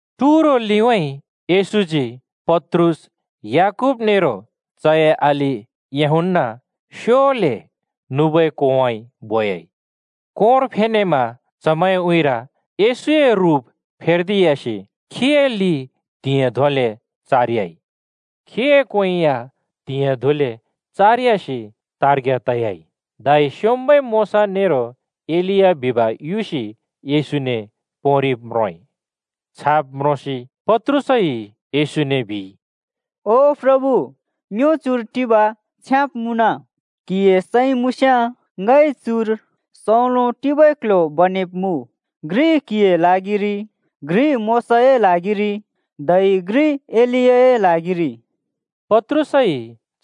टुरो लिउँइँ येशूजी पत्रुस, याकूब नेरो चए अलि यूहन्‍ना स्योले नुबै कोंउँइँ बोयाइ। कोंर फेनेमा चमैंए उँइँर येशूए रुप फेर्दियासि खीए लि त्‍हिंयाँ धोंले चारयाइ। खीए क्वें या त्हिंयाँ धोंले चारयासि तार्ग्या तयाइ। धै स्‍योंम्‍बै मोशा नेरो एलिया बिब युसि येशूने पोंरिब म्रोंइ। छाब म्रोंसि पत्रुसइ येशूने बिइ, “ओ प्रभु, ङ्यो चुर टिब छ्याँब् मुँन। क्‍हिए सैं मुँस्‍याँ ङइ चुर सौंलो टिबै क्ल्ह्‍यो बनेब्मुँ। घ्रि क्‍हिए ल्हागिरि, घ्रि मोशाए ल्हागिरि धै घ्रि एलियाए ल्हागिरि!” पत्रुसइ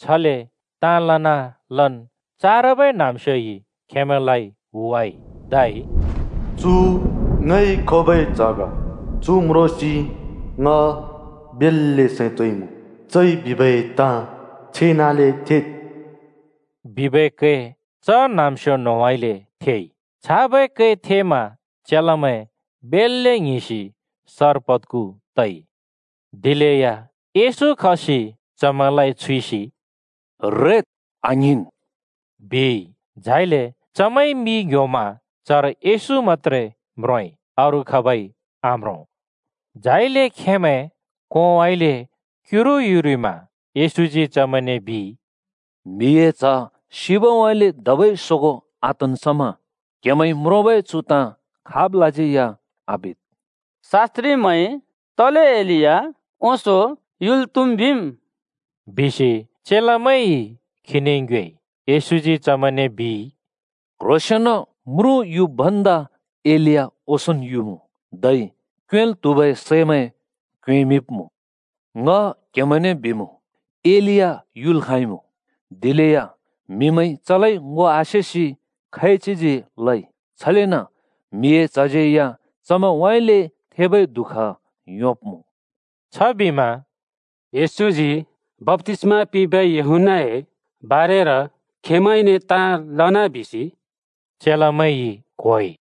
छले ताँ लनालन् चारबै न्‍हाँम्‍स्योइ खेमैंलाइ हुवाइ। धै “चु ङइ खोबै च्‍ह ग। चु म्रोंसि ङ बेल्‍ले सैं तोंइमुँ। चइ बिबै ताँ छेनाले थेद्!” बिबै कै च न्‍हाँम्‍स्यो न्‍होंउँइँले थेइ। छाबै कै थेमा चेलामैं बेल्‍ले ङ्हिंसि सर पद्खु तइ। दिलेया येशू खसि चमैंलाइ छुइसि “रेद्, आङ्हिंन्,” बिइ। झाइले चमैंइ मि ङ्‌ह्‍योमा चर येशू मत्‍त्रे म्रोंइ अरू खाबै आम्रों। झाइले खेंमैं कोंउँइँले क्‍युरु युरिमा येशूजी चमैंने बिइ, “म्हिए च्ह सिबउँइँले धबै सोगों आतन् समा क्हेमैंइ म्रोंबै चु ताँ खाबलाज्यै या आबिद्।” “शास्‍त्रिमैंइ तले एलिया ओंसों युल् त्हुम् बिम्?” बिसि चेलामैंइ खीने ङ्योएइ। येशूजी चमैंने बिइ, “क्‍ह्रोंसेंन म्रुँ युब् भन्दा एलिया ओंसोंन् युमुँ, धै क्योंएँल् त्हुबै सैमैं क्योंएँमिंब्मुँ। ङ क्हेमैंने बिमुँ, एलिया युल् खाँइमुँ, दिलेया म्‍हिमैंइ चलाइ ङो आसेसि खैच्हिजी लइ। छलेन म्हिए च्हज्यै या चमैंउँइँले थेबै दुःख योंब्मुँ।” छबिमा “येशूजी बप्‍तिस्‍मा पिंबै यूहन्‍नाए बारेर खेंमैंने ताँ लना बिसि,” चेलामैंइ क्‍होइ।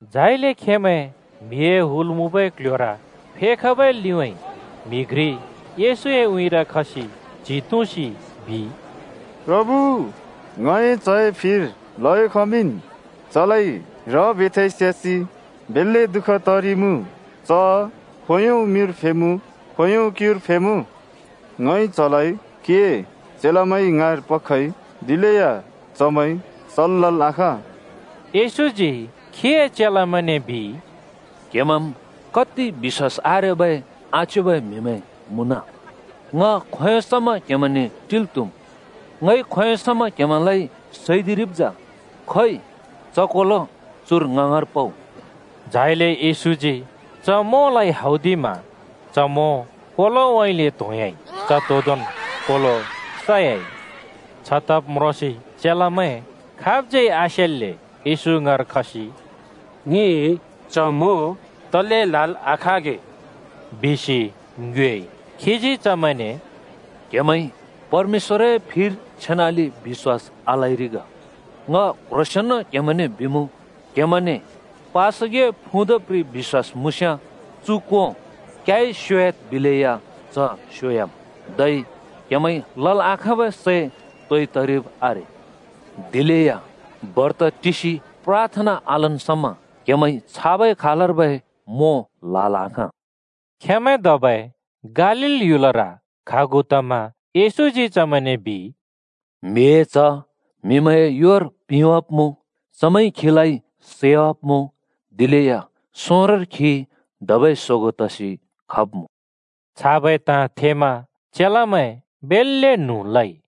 झाइले चमैं म्‍हिए हुल मुँबै क्‍ल्‍ह्‍योर फेखबै लिउँइँ म्‍हि घ्रि येशूए उँइँर खसि च्हि तुँसि बिइ, “प्रभु, ङए च्‍हए फिर ल्हयो खमिंन्। चलाइ र बेथाइ स्‍यासि बेल्‍ले दुःख तरिइमुँ। च खोंयों मिर फेमुँ, खोंयों क्‍युर फेमुँ। ङइ चलाइ क्‍हिए चेलामैं ङाँर पखइ, दिलेया चमैंइ सल् लल् आखाँला।” येशूजी खीए चेलामैंने बिइ, “क्हेमैंम् कति बिश्‍वास आरेबै आच्योबै म्‍हिमैं मुँन! ङ खोंयों समा क्‍हेमैंने टिल् त्‍हुम्? ङइ खोंयों समा क्हेमैंलाइ सैदिरिब् जा? खोइ च कोलो चुर ङ ङाँर पउ।” झाइले येशूजी च मोंलाइ हौदिमा च मों कोलोउँइँले त्‍होंह्‍याइ। च तोदोंन् कोलो सयाइ। छतब् म्रोंसि चेलामैं खाबज्यै आसेल्‍ले येशू ङाँर खसि “ङिइ च मों तले ल्‍हाल् आखाँगे?” बिसि ङ्योएइ। खीजी चमैंने “क्‍हेमैंइ परमेश्‍वरए फिर छेनाले बिश्‍वास आलइरि ग। ङ क्ह्रोंसेंन क्हेमैंने बिमुँ, क्‍हेमैंने पासगिए फुँ द प्रि बिश्‍वास मुँस्‍याँ चु कों ‘क्‍याइ स्‍योह्‍याद्’ बिलेया च स्‍योह्‍याम्। धै क्‍हेमैंइ लल् आखाँबै सै तोइ तरिब् आरे।” [दिलेया बर्त टिसि प्राथना आलन् समा क्‍हेमैंइ छाबै खालर्बै मों ल्‍हाल् आखाँ।] खेंमैं धबै गालील ह्‍युलर खागु तमा येशूजी चमैंने बिइ, “म्हिए च्ह म्‍हिमैंए योर पिंवाब्मुँ। चमैंइ खीलाइ सैवाब्‍मुँ, दिलेया सोंरोंर खी धबै सोगों तसि खब्‍मुँ।” छाबै ताँ थेमा चेलामैं बेल्‍ले न्हुँ लइ।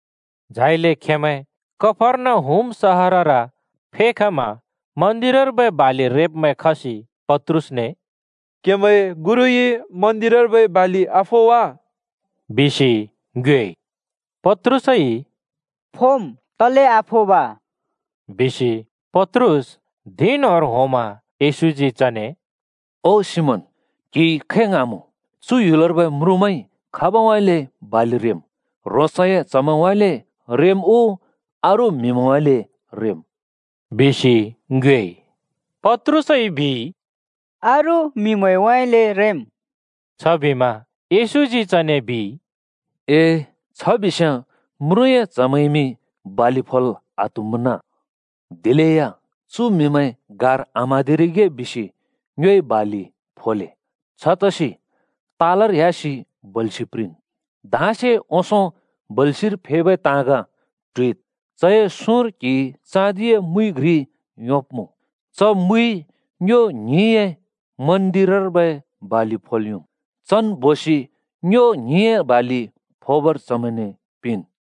झाइले खेंमैं कफर्नहुम सहरर फेखमा मन्दिरर्बै बालि रेब्‍मैं खसि पत्रुसने “क्‍हेमैंए गुरुइ मन्दिरर्बै बालि आफो वा?” बिसि ङ्योएइ। पत्रुसइ “फोम्, तले आफोब!” बिसि पत्रुस धिं न्‍होंर होंमा येशूजी चने “ओ सिमोन, क्‍हिइ खै ङ्हाँमुँ? चु ह्‍युलर्बै म्रुँमैंइ खाबउँइँले बालि रेम्? ह्रोंसए च्हमैंउँइँले रेम् उ अरू म्‍हिमैंउँइँले रेम्?” बिसि ङ्योएइ। पत्रुसइ “अरू म्‍हिमैंउँइँले रेम् बिइ।” छबिमा येशूजी चने बिइ, “ए, छ बिस्‍याँ म्रुँए च्हमैंइमि बालि फोल् आत्‍हुमुना। दिलेया चु म्‍हिमैं गार आम्‍हाँदिरिगे बिसि ङ्योइ बालि फोले। छतसि तालर ह्‍यासि बल्‍छि प्रिंन्। धाँसे ओंसों बल्‍छिर फेबै ताँग ट्हुइद्। चए सुँर क्‍हिइ चाँदिए मुइ घ्रि योंब्‍मुँ। च मुइ ङ्यो ङ्हिंए मन्दिरर्बै बालि फोब् योम्। चन् बोसि ङ्यो ङ्हिंए बालि फोबर चमैंने पिंन्।”